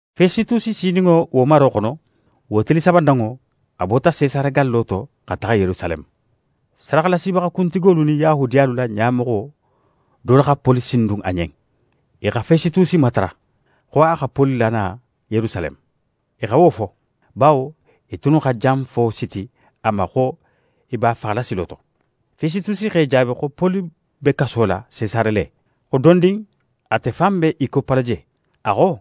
Fesitusi sininŋo wo maro xono, wo tili sabananŋo, a bota Sesare gallo to xa taxa Yerusaleme. Sadaxalasibaxa kuntigolu nin Yahudiyalu la ɲamoxo dolu xa Poli sindun a ɲen. I xa Fesitusi matara, xo a xa Poli lana Yerusaleme. I xa wo fo, bawo i tunnu xa janfo siti a ma xo i b'a faxala silo to. Fesitusi x'e jaabi xo Poli be kaso la Sesare le, xo dondin ate fan be í koppala je. A xo: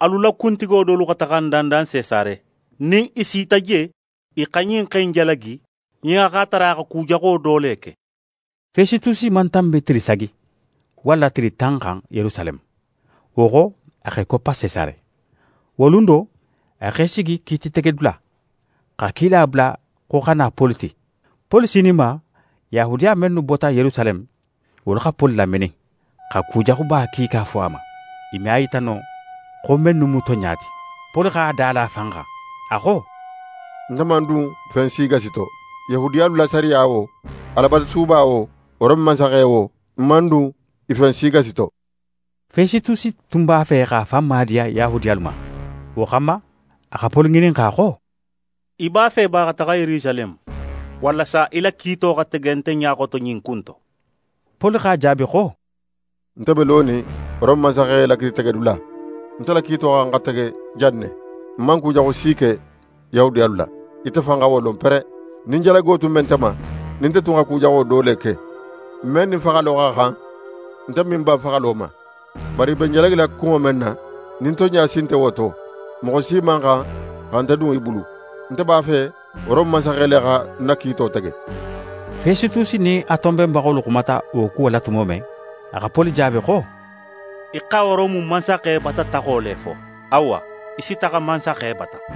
«Alu la kuntigo dolu xa taxa ń dandan Sesare. Nin i sita je, i xa ɲin xe in jalagi nin a x'a tara a xa ku jaxo do le ke.» Fesitusi man tanbi tili sagi, walla tili tan xan Yerusaleme, wo xo, a x'é koppa Sesare. Wo lun do, a x'é sigi kiititegedula, xa kila bula xo xa na Poli ti. Poli sininma, Yahudiya mennu bota Yerusaleme, wolu xa Poli laminin, xa kujaxuba kiika fo a ma, i me a yita no xo mennu mu tonɲa ti. Poli x'a da la a fan xan. A xo: «Nte man dun fen gasi to, Yahudiyalu la sariya wo, Alabatusuba wo, Rome mansaxe wo, ń man dun i fen si gasi to.» Fesitusi tun b'a fe x'a fan maadiya Yahudiyalu ma. Wo xanma, a xa Poli ŋininxa xo: «Í b'a fe ba xa taxa Yerusaleme, walasa í la kiito xa tege nte ɲa xoto ɲin ku in to?» Poli x'a jaabi xo: «Nte be lonin Rome mansaxe la kiititegedula, nte la kiito xa xan xa tege jan ne. Ń man kujaxu si ke Yahudiyalu la, ite fan xa wo lon pere. Nin jalago tun be nte ma, nin nte tun xa ku jaxo do le ke, men nin faxalo xa xan, nte me ń ban faxalo ma. Bari i be ń jalagila kunŋo men na, nin tonɲa si nte wo to, moxo si man xan xa nte dun i bulu. Nte b'a fe Rome mansaxe le xa ń na kiito tege.» Fesitusi nin a tonbenbaxolu xumata wo kuwo la tumo men, a xa Poli jaabi xo: «Í xa Rome mansaxe bata taxo le fo. Awa, í si taxa mansaxe bata.»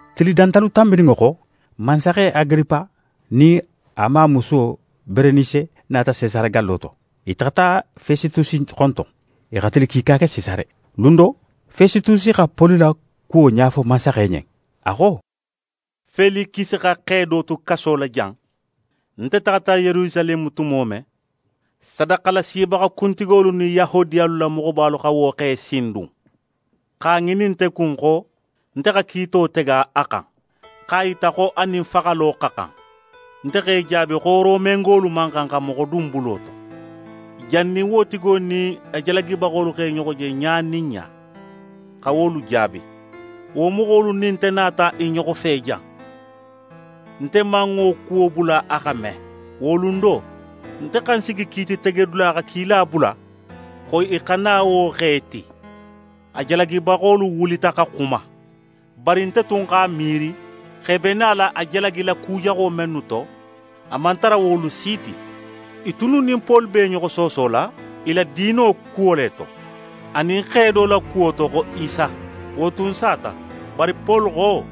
Tili dantalu tanbininŋo xo, mansaxe Agiripa nin a mamusuwo Berenise nata Sesare gallo to. I taxata Fesitusi xonton. I xa tili kiika ke Sesare. Lun do, Fesitusi xa Poli la kuwo ɲafo mansaxe ɲen. A xo: «Felikisi xa xe do tu kaso la jan. Nte taxata Yerusaleme tumo men, sadaxalasibaxa kuntigolu nin Yahudiyalu la moxobalu xa wo xe sindun, x'a ŋinin nte kun xo nte xa kiito tege a xan, x'a yita xo a nin faxalo xa xan. Nte x'e jaabi xo Romengolu man xan xa moxo dun bulo to, jannin wo tigo nin a jalagibaxolu x'e ɲoxo je ɲa nin ɲa, xa wolu jaabi. Wo moxolu nin nte nata i ɲoxo fe jan. Nte man wo kuwo bula a xa me. Wo lun do, nte xa ń sigi kiititegedula xa kila bula xo i xa na wo xe ti. A jalagibaxolu wulita xa xuma. Bari nte tun x'a miiri xo i be nala a jalagila ku jaxo mennu to, a man tara wolu si ti. I tunnu nin Poli be i ɲoxo soosola i la diino kuwo le to, anin xe do la kuwo to xo Isa. Wo tun sata, bari Poli xo,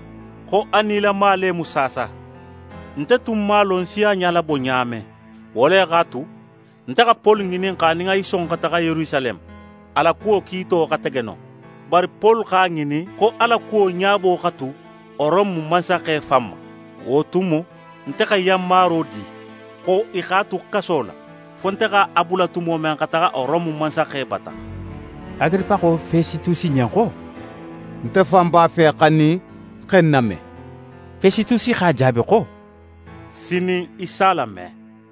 xo a nilama le mu saasa. Nte tun man a lon ń si a ɲalabo ɲa men, wo le x'a tu, nte xa Poli ŋininxa nin a si son xa taxa Yerusaleme, a la kuwo kiito xa tege non. Bari Poli x'a ŋinin xo a la kuwo ɲabo xa tu Rome mansaxe fan ma. Wo tumo, nte xa yanmaro di, xo i x'a tu kaso la, fo nte x'a bula tumo men xa taxa Rome mansaxe bata.» Agiripa xo Fesitusi ɲen xo: «Nte fan b'a fe xa ɲin xe in name.» Fesitusi x'a jaabi xo: «Sinin, í s'a lame.»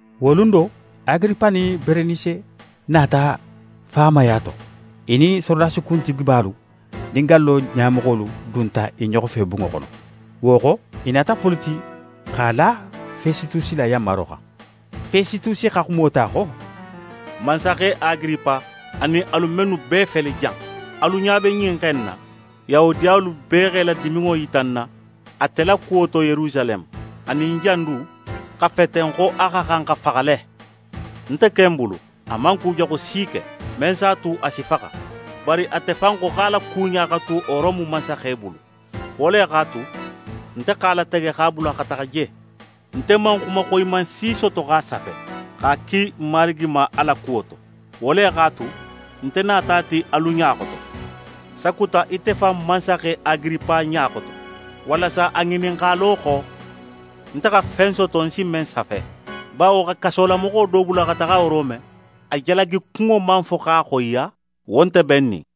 Wo lun do, Agiripa nin Berenise nata faamaya to. I nin sorodasi kuntigibalu nin gallo ɲamoxolu dunta i ɲoxo fe bunŋo xono. Wo xo, i nata Poli ti x'a la Fesitusi la yanmaro xan. Fesitusi xa xumo ta xo: «Mansaxe Agiripa, anin alu mennu bee fele jan, alu ɲa be ɲin xe in na, Yahudiyalu bee x'e la diminŋo yita ń na ate la kuwo to Yerusaleme, anin jan du, xa feten xo a xa xan xa faxa le. Nte ken bulu, a man kujaxu si ke, men s'a tu a si faxa. Bari ate fan xo x'a la kuɲa xa tu Rome mansaxe bulu. Wo le x'a tu, nte x'a latege x'a bula xa taxa je. Nte man xuma xoyiman si soto x'a safe, x'a ki marigi ma a la kuwo to. Wo le x'a tu, nte nata a ti alu ɲa xoto, sakuta ite fan mansaxe Agiripa ɲa xoto, walasa a ŋininxalo xo, nte xa fen soto ń si men safe. Bawo xa kasolamoxo do bula xa taxa Rome, a jalagikunŋo man fo x'a xoyiya, wo nte bennin.»